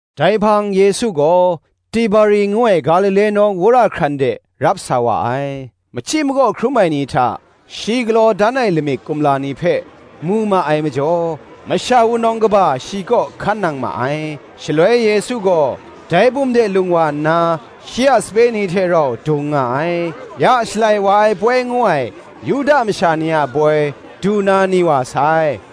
Dai hpang Yesu gaw, Tiberi ngu ai Galile nawng wora hkran de rap sa wa ai. Machyi makaw hkrum ai ni hta, shi galaw dan ai lamik kumla ni hpe mu ma ai majaw, masha wunawng kaba shi kaw hkan nang ma ai. Shaloi Yesu gaw dai bum de lung wa nna, shi a sape ni hte rau dung nga ai. Ya, Shalai wa ai poi ngu ai, Yuda masha ni a poi, du na ni wa sai.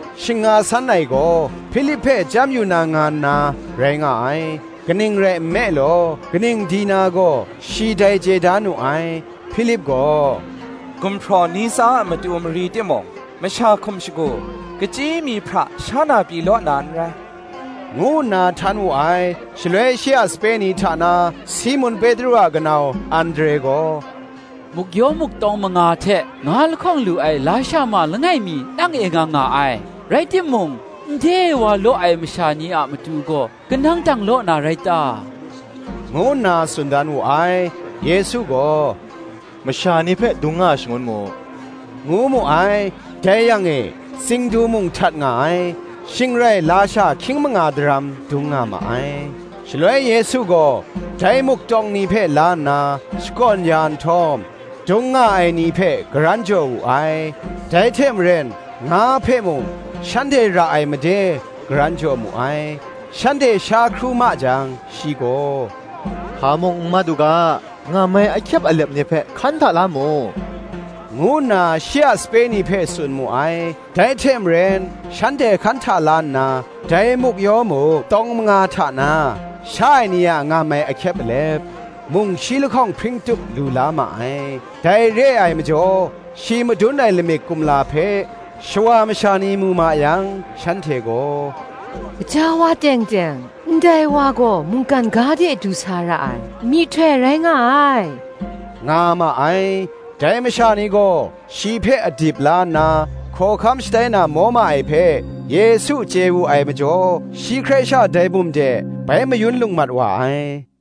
Shing nga san ai gaw, Hpilip hpe chyam yu na nga nna rai nga ai: kaning rai nme law, kaning di na gaw, shi dai chye da nu ai. Hpilip gaw, “Gumhpraw ni tsa a matu mari timung, masha hkum shagu, kachyi mi hpra sha na pyi law na n rai,” ngu nna htan wu ai. Shaloi, shi a sape ni hta na Simun Petru a kanau Andre gaw, “Muk-yaw muk tawng manga hte, nga lahkawng lu ai lasha ma langai mi nang e nga nga ai; rai timung, nde wa law ai masha ni a matu gaw kanang dang law na rai ta?” ngu nna tsun dan wu ai. Yesu gaw, “Masha ni hpe dung nga shangun mu,” ngu mu ai. Dai yang e tsingdu mung htat nga ai. Shing rai lasha hkying manga daram dung nga ma ai. Shaloi Yesu gaw dai muk tawng ni hpe la nna, shakawn ya nhtawm, dung nga ai ni hpe karan jaw wu ai; dai hte maren nga hpe mung shanhte ra ai made, karan jaw mu ai. Shanhte sha hkru ma jang, shi gaw, “Hpa mung n mat u ga, ngam ai ahkyep alep ni hpe hkan hta la mu,” ngu nna shi a sape ni hpe tsun mu ai. Dai hte maren shanhte hkan hta la nna, dai muk-yaw muk tawng manga hta na, sha ai ni a ngam ai ahkyep alep, mung shi lahkawng hpring tup lu la ma ai. Dai re ai majaw, shi madun ai lamik kumla hpe, shawa masha ni mu ma yang, shanhte gaw, “Gaja wa teng teng ndai wa gaw mungkan ga de du sa ra ai myihtoi rai nga ai,” nga ma ai. Dai masha ni gaw shi hpe adip la nna, hkawhkam shatai na maw ma ai hpe, Yesu chye wu ai majaw, shi hkrai sha dai bum de bai mayun lung mat wa ai.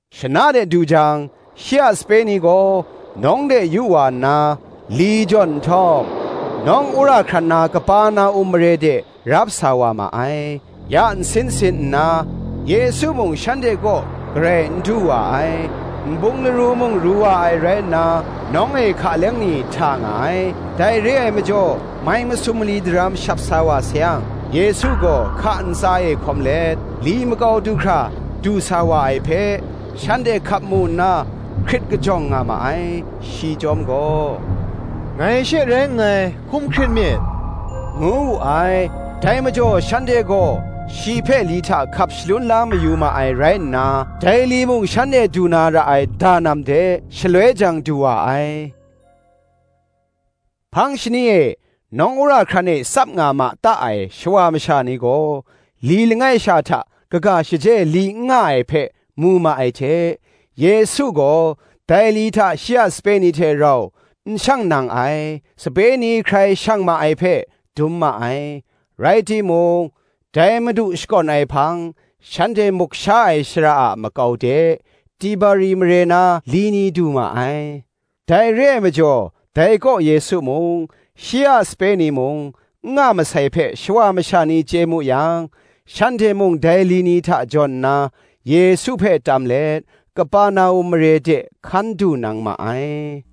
Shana de du jang shi a sape ni gaw nawng de yu wa nna, li jawn nhtawm, nawng wora hkran na Kaperna-um mare de rap sa wa ma ai. Ya nsin sin nna, Yesu mung shanhte kaw garai n du wa ai: nbung laru mung ru wa ai rai nna, nawng e hka leng ni hta nga ai. Dai re ai majaw mai masum mali daram shap sa wa sayang, Yesu gaw hka ntsa e hkawm let, li makau du hkra du sa wa ai hpe, shanhte hkap mu nna, hkrit kajawng nga ma ai. Shi chyawm gaw, “Ngai she rai nngai, hkum hkrit myit,” ngu wu ai. Dai majaw shanhte gaw shi hpe li hta hkap shalun la mayu ma ai rai nna, dai li mung shanhte du na ra ai danam de, shaloi jang du wa ai. Hpang shani e nawng wora hkran e tsap nga ma ta ai shawa masha ni gaw, li langai sha hta kaga shaje li n nga ai hpe mu ma ai hte, Yesu gaw dai li hta shi a sape ni hte rau n shang nang ai, sape ni hkrai shang ma ai hpe, dum ma ai: (rai timung, dai Madu shakawn ai hpang, shanhte muk sha ai shara a makau de, Tiberi mare na li ni du ma ai): dai re ai majaw dai kaw Yesu mung, shi a sape ni mung, n nga masai hpe, shawa masha ni chye mu yang, shanhte mung dai li ni hta jawn nna, Yesu hpe tam let Kaperna-um mare de hkan du nang ma ai.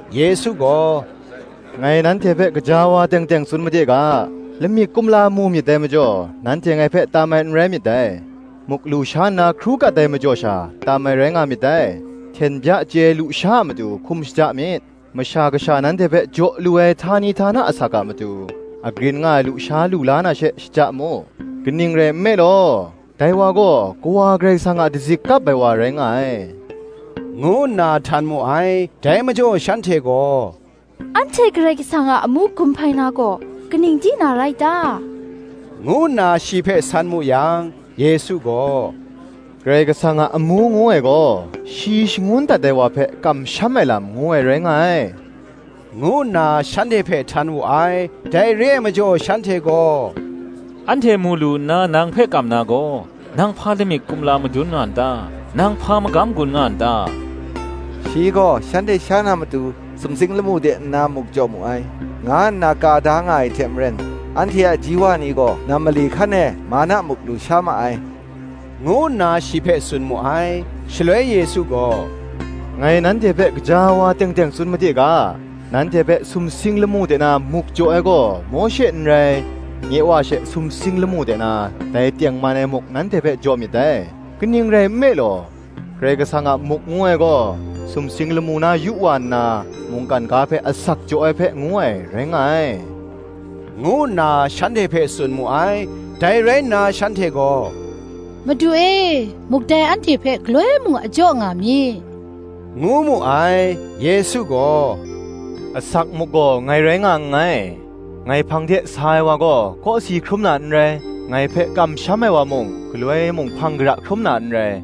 Yesu gaw, “Ngai nanhte hpe gaja wa teng teng tsun made ga, Lamik kumla mu myit dai majaw, nanhte ngai hpe tam ai n rai myit dai; muk lusha nna hkru kat ai majaw sha, tam ai rai nga myit dai. Hten bya chye ai lusha a matu hkum shaja myit; Masha Kasha nanhte hpe jaw lu ai htani htana asak a matu, agrin nga ai lusha lu la na she shaja mu: kaning rai nme law, dai wa gaw, Kawa Karai Kasang a dazik kap ai wa rai nga ai,” ngu nna htan mu ai. Dai majaw shanhte gaw, “Anhte Karai Kasang a amu gun hpai na gaw, kaning di na rai ta?” ngu nna shi hpe san mu yang, Yesu gaw, “Karai Kasang a amu ngu ai gaw, shi shangun dat ai wa hpe kamsham ai lam, ngu ai rai nga ai,” ngu nna shanhte hpe htan wu ai. Dai re ai majaw shanhte gaw, “Anhte mu lu nna nang hpe kam na gaw, nang hpa lamik kumla madun nga n ta? nang hpa magam gun nga n ta? Shi gaw shanhte sha na matu, sumsing lamu de nna muk jaw mu ai, nga nna ka da nga ai hte maren, anhte a ji wa ni gaw nam mali hkan e manna muk lusha ma ai,” ngu nna shi hpe tsun mu ai. Shaloi Yesu gaw, “Ngai nanhte hpe gaja wa teng teng tsun made ga, Nanhte hpe sumsing lamu de na muk jaw ai gaw Mawshe n rai; nye Wa she sumsing lamu de na dai tengman ai muk nanhte hpe jaw myit dai: kaning rai nme law, Karai Kasang a muk ngu ai gaw, sumsing lamu na yu wa nna, mungkan ga hpe asak jaw ai hpe ngu ai, rai nga ai,” ngu nna shanhte hpe tsun mu ai. Dai rai nna shanhte gaw, “Madu e, muk dai anhte hpe galoi mung a jaw nga mi,” ngu mu ai. Yesu gaw, “Asak muk gaw ngai rai nga nngai, ngai hpang de sa ai wa gaw kawsi hkrum na n rai, ngai hpe kamsham ai wa mung, galoi mung hpang kara hkrum na n rai.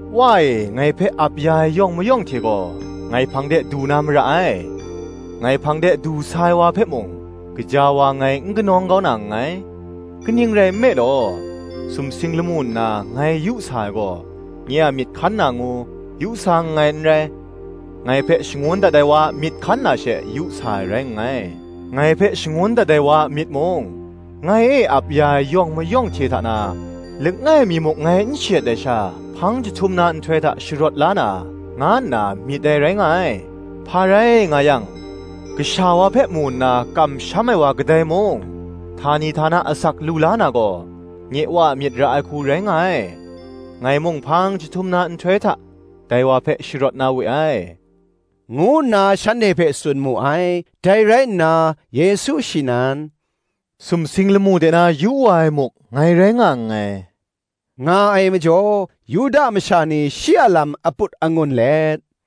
Wa e ngai hpe ap ya ai yawng mayawng hte gaw, ngai hpang de du na mara ai; ngai hpang de du sa ai wa hpe mung, gaja wa ngai n kanawng kau na nngai. Kaning rai nme law, sumsing lamu nna ngai yu sa ai gaw, nye a myit hkan na ngu, yu sa nngai n rai, ngai hpe shangun dat ai wa a myit hkan na she, yu sa ai rai nngai. Ngai hpe shangun dat ai wa a myit mung, ngai e ap ya ai yawng mayawng hte hta na, langai mi muk ngai n shayet ai sha, hpang jahtum na nhtoi hta sharawt la na, nga nna myit ai rai nga ai. Hpa rai nga yang, Kasha wa hpe mu nna, kamsham ai wa kadai mung htani htana asak lu la na gaw, nye Wa a myit ra ai hku rai nga ai: ngai mung hpang jahtum na nhtoi hta, dai wa hpe sharawt na we ai,” ngu nna shanhte hpe tsun mu ai. Dai rai nna Yesu shi nan, “Sumsing lamu de na yu wa ai muk ngai rai nga nngai,” nga ai majaw, Yuda masha ni shi a lam aput angun let,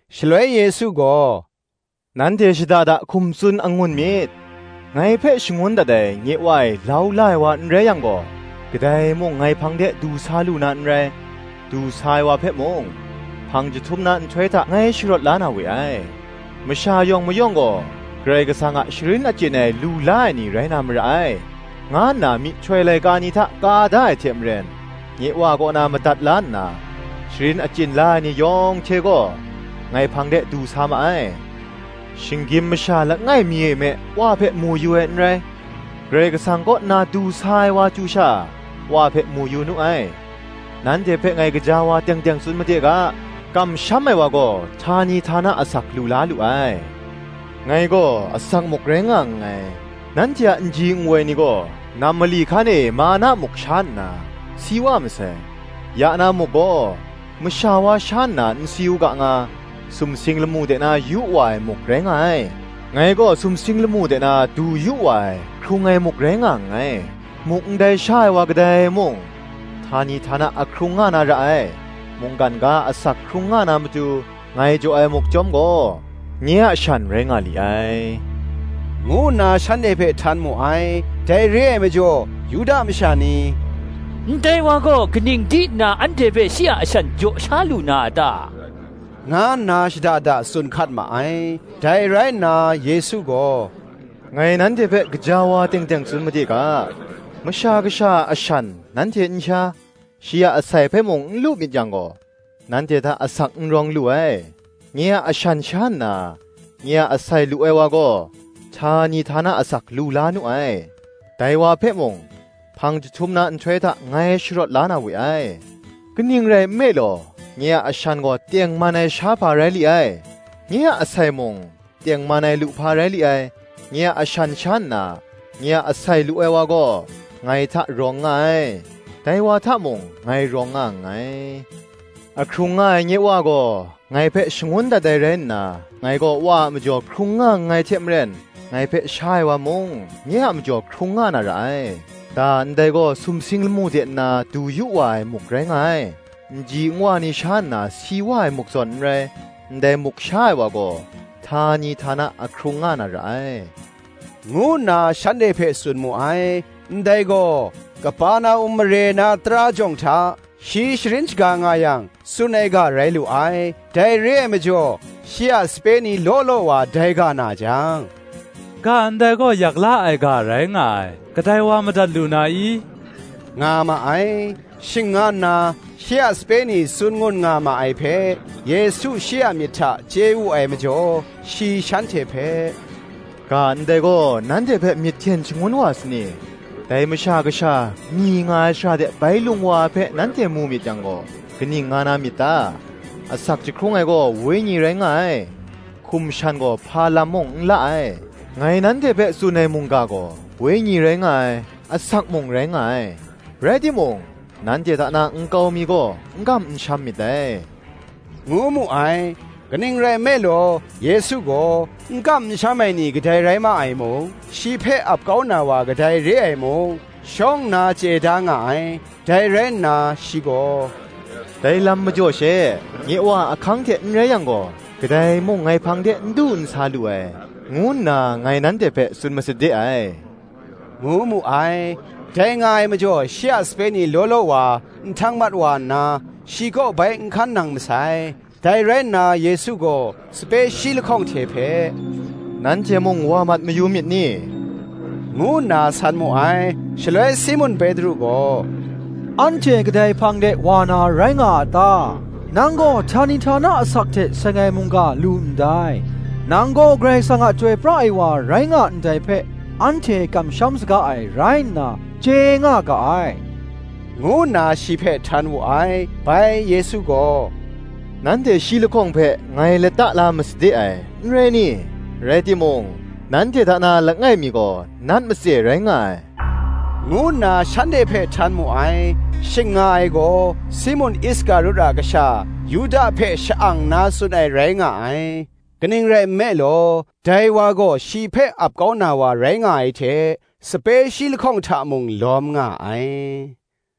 Shaloi Yesu gaw, “Nanhte shada da hkum tsun angun myit: ngai hpe shangun dat ai nye Wa e lau la ai wa n rai yang gaw, kadai mung ngai hpang de du sa lu na n rai; du sa ai wa hpe mung, hpang jahtum na nhtoi hta ngai sharawt la na we ai. ‘Masha yawng mayawng gaw Karai Kasang a sharin achyin ai lu la ai ni rai na mara ai,’ nga nna myihtoi laika ni hta ka da ai hte maren, nye Wa kaw na madat la nna, sharin achyin la ai ni yawng hte gaw, ngai hpang de du sa ma ai. Shinggyim masha langai mi e me Wa hpe mu yu ai n rai; Karai Kasang kaw nna du sa ai wa chyu sha, Wa hpe mu yu nu ai. Nanhte hpe ngai gaja wa teng teng tsun made ga, Kamsham ai wa gaw htani htana asak lu la lu ai. Ngai gaw asak muk rai nga nngai. Nanhte a nji nwoi ni gaw nam mali hkan e manna muk sha nna, si wa masai. Ya na muk gaw, masha wa sha nna n si u ga nga, sumsing lamu de na yu wa ai muk rai nga ai. Ngai gaw sumsing lamu de na du yu wa ai, hkrung ai muk rai nga nngai: muk ndai sha ai wa kadai mung, htani htana ahkrung nga na ra ai: mungkan ga a asak hkrung nga na matu, ngai jaw ai muk chyawm gaw, nye a shan rai nga li ai,” ngu nna shanhte hpe htan mu ai. Dai re ai majaw Yuda masha ni, “Ndai wa gaw, kaning di nna anhte hpe shi a ashan jaw sha lu na a ta?” nga nna shada da tsun hkat ma ai. Dai rai nna Yesu gaw, “Ngai nanhte hpe gaja wa teng teng tsun made ga, Masha Kasha a ashan nanhte n sha, shi a asai hpe mung n lu myit yang gaw, nanhte hta asak n rawng lu ai. Nye a ashan sha nna, nye a asai lu ai wa gaw, htani htana asak lu la nu ai: dai wa hpe mung, hpang jahtum na nhtoi hta ngai sharawt la na we ai: kaning rai nme law, nye a ashan gaw tengman ai shahpa rai li ai; nye a asai mung, tengman ai luhpa rai li ai. Nye a ashan sha nna, nye a asai lu ai wa gaw, ngai hta rawng nga ai; dai wa hta mung ngai rawng nga nngai. A hkrung nga ai nye Wa gaw, ngai hpe shangun dat ai rai nna, ngai gaw Wa a majaw hkrung nga nngai hte maren, ngai hpe sha ai wa mung, nye a majaw hkrung nga na ra ai. Da ndai gaw sumsing lamu de nna du yu wa ai muk rai nga ai: nji nwa ni sha nna si wa ai muk zawn n rai: ndai muk sha ai wa gaw, htani htana ahkrung nga na ra ai,” ngu nna shanhte hpe tsun mu ai. Ndai gaw, Kaperna-um mare na tara jawng hta, shi sharin shaga nga yang, tsun ai ga rai lu ai. Dai re ai majaw shi a sape ni law law wa dai ga na jang, “Ga ndai gaw yak la ai ga rai nga ai, kadai wa madat lu na i?” nga ma ai. Shing nga nna shi a sape ni tsun ngun nga ma ai hpe, Yesu shi a myit hta chye wu ai majaw, shi shanhte hpe, “Ga ndai gaw nanhte hpe myit hten shangun wa sa ni? Dai Masha Kasha, myi nga ai shara de bai lung wa ai hpe nanhte mu myit yang gaw, kaning nga na myit ta? Asak jahkrung ai gaw Wenyi rai nga ai; hkum shan gaw hpa lam mung n la ai: ngai nanhte hpe tsun ai mungga gaw, Wenyi rai nga ai, asak mung rai nga ai. Rai timung nanhte hta na nkau mi gaw n kam n sham myit dai,” ngu mu ai. Kaning rai nme law, Yesu gaw, n kam n sham ai ni kadai rai ma ai mung, shi hpe ap kau na wa kadai re ai mung, shawng nna chye da nga ai. Dai rai nna shi gaw, “Dai lam majaw she, nye Wa a ahkang hte n rai yang gaw, kadai mung ngai hpang de n du n sa lu ai, ngu nna ngai nanhte hpe tsun masade ai,” ngu mu ai. Dai nga ai majaw shi a sape ni law law wa nhtang mat wa nna, shi kaw bai n hkan nang masai. Dai rai nna Yesu gaw sape shi lahkawng hte hpe, “Nanhte mung wa mat mayu myit ni?” ngu nna san mu ai. Shaloi Simun Petru gaw, “Anhte kadai hpang de wa na rai nga a ta? nang gaw htani htana asak hte seng ai mungga lu ndai: nang gaw Karai Kasang a Chyoi pra ai wa rai nga ndai hpe, anhte kamsham saga ai rai nna, chye nga ga ai,” ngu nna shi hpe htan wu ai. Bai Yesu gaw, “Nanhte shi lahkawng hpe ngai lata la masade ai, n rai ni? rai timung, nanhte hta na langai mi gaw nat matse rai nga ai,” ngu nna shanhte hpe htan mu ai. Shing nga ai gaw, Simun Iskarut a kasha Yuda hpe sha-ang nna tsun ai rai nga ai: kaning rai nme law, dai wa gaw shi hpe ap kau na wa rai nga ai hte, sape shi lahkawng hta mung lawm nga ai.